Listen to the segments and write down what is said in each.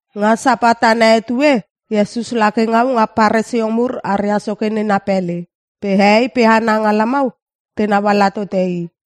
Nga Sapat ana etue Iesus lake ngau nga Paresio mur aria soke nena pele. Pe hehei pe hana nga lamau tenau ala tote i.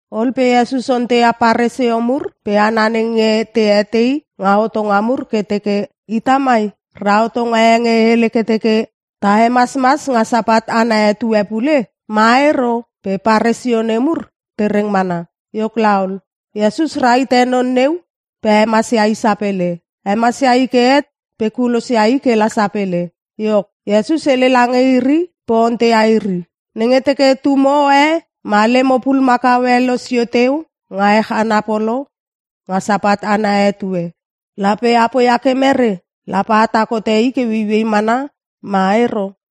Ol pe Iesus onteia Paresio mur pe hana nenge te etei nga hotonga mur ke teke, “Ita mai ra hotonga e nge hele ke teke ta hemasmas nga Sapat ana etue pule? Ma ero?” Pe Paresio nemur te reng mana. Iok laol, Iesus rahite non neu pe hemasia i sapele. Hemasia i ke het pe kulosia i ke la sapele. Iok, Iesus hele lange iri pe onteia iri, “Nenge teke tumo e ma lemo pulumakau e losio teu nga ech ana polo nga Sapat ana etue lape a poia ke mere? Lape atak hote i ke ueiuei mana ma ero?”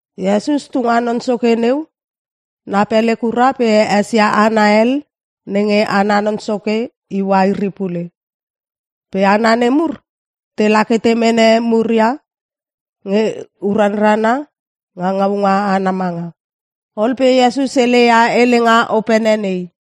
Iesus tu nga non soke neu na pele kura pe esia hana hel nenge ana non soke iua iri pule. Pe hana nemur tela ke te mene muria nge uranrana nga ngaunga ana manga. Ol pe Iesus heleia helenga opene nei.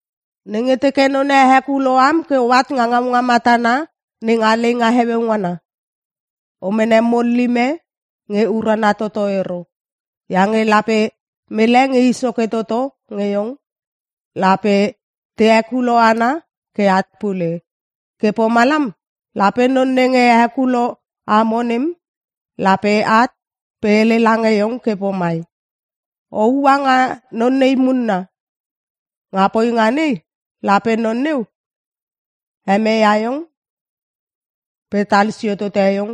“Nenge teke none hekulo am ke oat nga ngaunga matana nenga leinga heueu ngana, o mene mullim e nge urana toto ero. Iange lape mele nge i soke toto nge iong lape te hekulo ana ke at pule. Ke pomlam lape non nenge hekulo amo nem lape at pe hele lange iong ke pomai, ‘O ua nga non nei munna!’ Nga poinga nei lape non neu hemeia iong pe talsio tote iong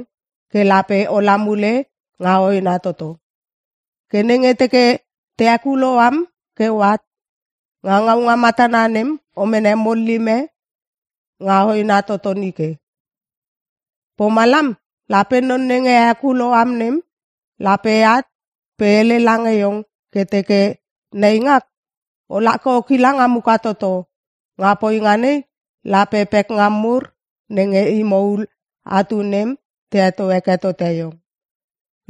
ke lape ola mule nga hoena toto. Ke nenge teke te hekulo am ke oat nga ngaunga matana nem o mene mullim e nga hoena toto nike. Pomalam lape non nenge hekulo am nem lape at pe hele lange iong ke teke, ‘Neingak, ola ke o kila nga muka toto.’ Nga poinga nei lape pekngam mur nenge imo ul atu nem te heto heke tote iong.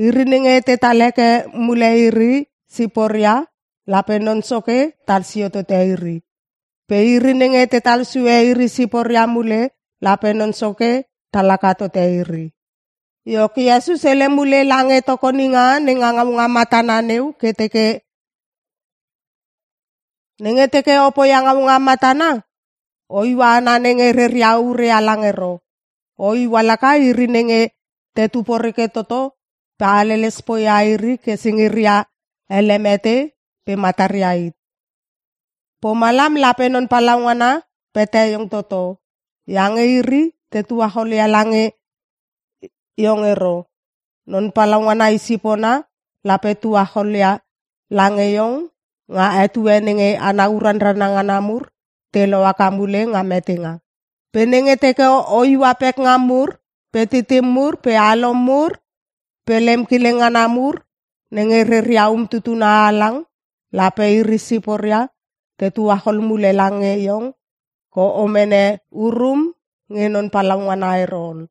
Iri nenge tetal heke mule iri siporia, lape Non Soke tal sio tote iri. Pe iri nenge tetal sue iri siporia mule lape Non Soke tal haka tote iri.” Iok Iesus hele mule lange tokoninga nenga ngaunga matana neu ke teke, “Nenge teke o poia ngaunga matana, o iua hana nenge reria ure halang ero. O iua laka iri nenge tetu poreke toto pe haleles poia iri ke singiria ele mete pe mataria hit. Pomalam lape Non Palaungana pete iong toto. Iange iri te tuacholia lange iong ero. Non Palaungana i sipona lape tuacholia lange iong nga etue nenge hana uranrana ngana mur te lohaka mule nga metenga. Pe nenge teke o iua pekngam mur pe titim mur pe alom mur pe lem kileng ngana mur nenge reria umtutuna halang lape iri siporia te tuachol mule lange iong ke o mene urum nge Non Palaungana ero ol.”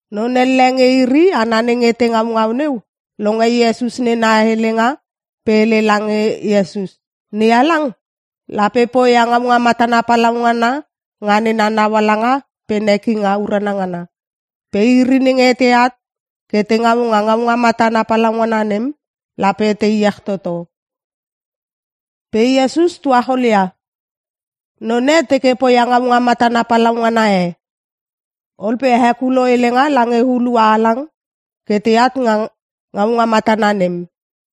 Non elle nge iri hana nenge te ngaungau neu, longe Iesus nena helenga pe hele lange Iesus, “NeHalang lape poia ngaunga matana palaungana nga nena naualanga pe nekinga urana ngana. Pe iri nenge teat ke te ngau nga ngaunga matana palaungana nem lape te iech toto.” Pe Iesus tuacholia, “Non e teke poia ngaunga matana palaungana e. Ol pe hekulo helenga lange hulua halang ke teat nga ngaunga matana nem.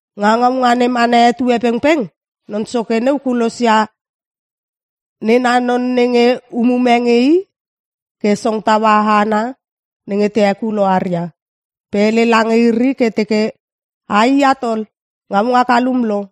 Nga ngaunga nem ana etue pengpeng non soke neu kulosia nena non nenge umume nge i ke song taua hana nenge te hekulo aria. Pe hele lange iri ke teke, ‘Aiat ol! Ngaunga kalum lo.’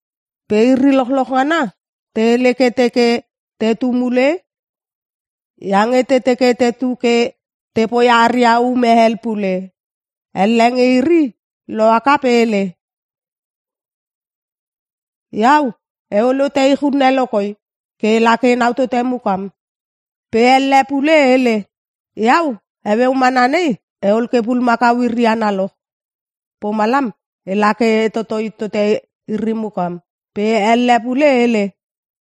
“Pe iri lochloch ngana te hele ke teke tetu mule iange te teke tetu ke te poia aria ume hel pule. Elle nge iri lohaka pe hele, ‘Iau eol hote ich unne lo koi ke ela ke enau tote mukam.’ “Pe elle pule hele, ‘Iau heueu mana nei eol ke pulumakau iri analoch. Pomalam ela ke e totoi tote iri mukam.’ “Pe elle pule hele,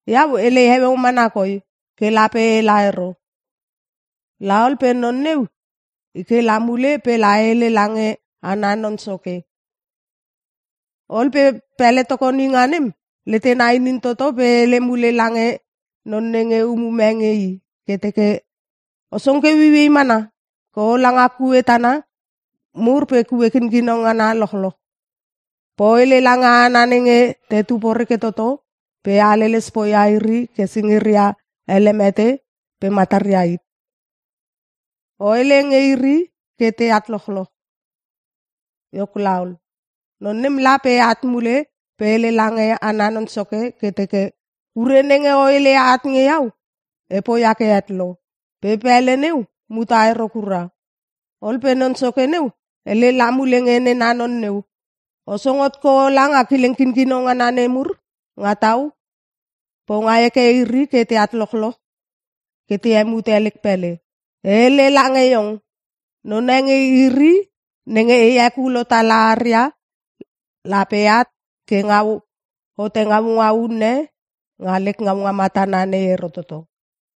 ‘Iau elei heueu mana koi ke lape ela ero.’ “La ol pe non neu i ke la mule pe la hele lange ana non soke. Ol pe pele tokoninga nem letena inin toto pe hele mule lange non nenge umume nge i ke teke, ‘O song ke ueiuei mana ke ola nga kue tana mur pe kue kinkino ngana lochloch pe o hele lange hana nenge tetu poreke toto pe haleles poia iri ke singiria ele mete pe mataria hit. O hele nge iri ke teat lochloch.’ “Iok laol, non nem la pe at mule pe hele lange ana non soke ke teke, ‘Ure nenge o heleia at nge iau e poia ke het lo. Pe pele neu muta ero kura.’ “Ol pe non soke neu hele la mule nge nena non neu, ‘O song hot ke ola nga kileng kinkino ngana nemur nga tau pe o ngai heke iri ke teat lochloch ke te hemute lek pele. E hele lange iong, none nge iri nenge e hekulo tala aria lape at ke ngau hote ngaunga unne nga lek ngaunga matana nei ero toto.’”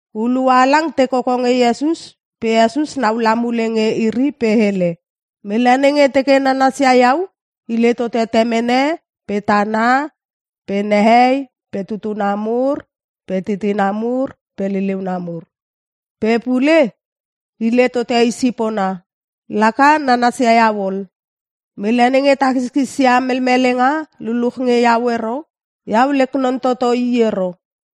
Hulua halang te koko nge Iesus pe Iesus naula mule nge iri pe hele, “Mele nenge teke nanasia iau hile tote temene pe tana pe nehei pe tutuna mur pe titina mur pe liliuna mur. Pe pule hile tote i sipona. Laka nanasia iau ol. Mele nenge takiskis ia melmelenga luluch nge iau ero, iau lek non toto laka i ero.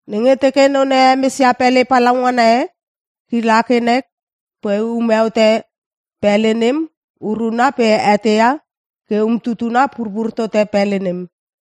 “Nenge teke none hemesia pele palaungana e, kila ke nek pe ume hote pele nem uruna pe eteia ke umtutuna purpur tote pele nem.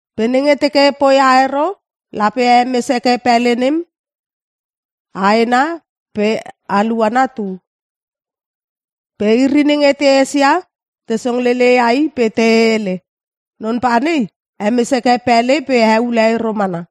Pe nenge teke poia ero lape hemes heke pele nem haena pe aluana tu. Pe iri nenge te esia te songlele ia i pe te hele, ‘Non panei hemes heke pele pe heule ero mana.’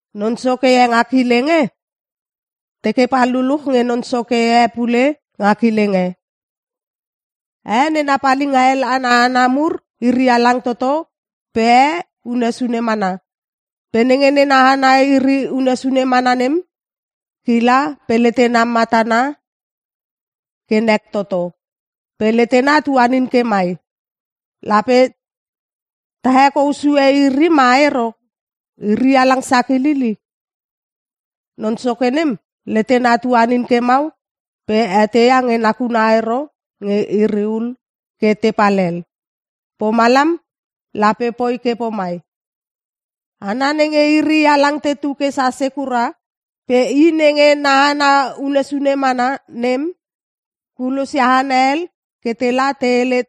“Non soke e nga kileng e teke pal luluch nge non soke e pule nga kileng e. E nena palinga hel ana hana mur iri halang toto pe e unne sune mana. Pe nenge nena hana iri unne sune mana nem, kila pe letena matana ke nek toto. Pe letena tuanin ke mai, ‘Lape ta hekou sue iri ma ero? Iri halang sakilil i!’ “Non soke nem letena tuanin ke mau pe eteia nge nakuna ero nge iri ul ke te palhel. Pomalam lape poi ke pomai; Hana nenge iri halang tetu ke sase kura pe i nenge na hana unne sune mana nem kulosia hana hel ke la te hele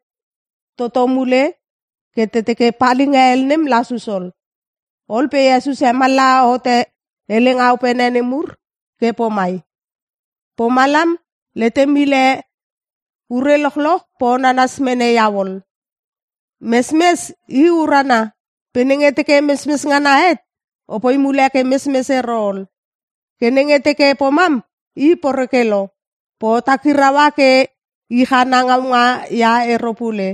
toto mule ke te teke palinga hel nem lasus ol.” Ol pe Iesus hemallaha hote helenga opene nemur ke pomai, “Pomalam letem hile ure lochloch pe o nanas mene iau ol. “Mesmes i urana pe nenge teke mesmes ngana het opoi mule ke mesmes ero ol. Ke nenge teke pomam i poreke lo. Pe o takiraua ke ich ana ngaunga ia ero pule.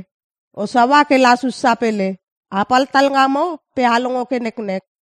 O saua ke lasus sapele. Apal talngamo pe a long ke neknek!”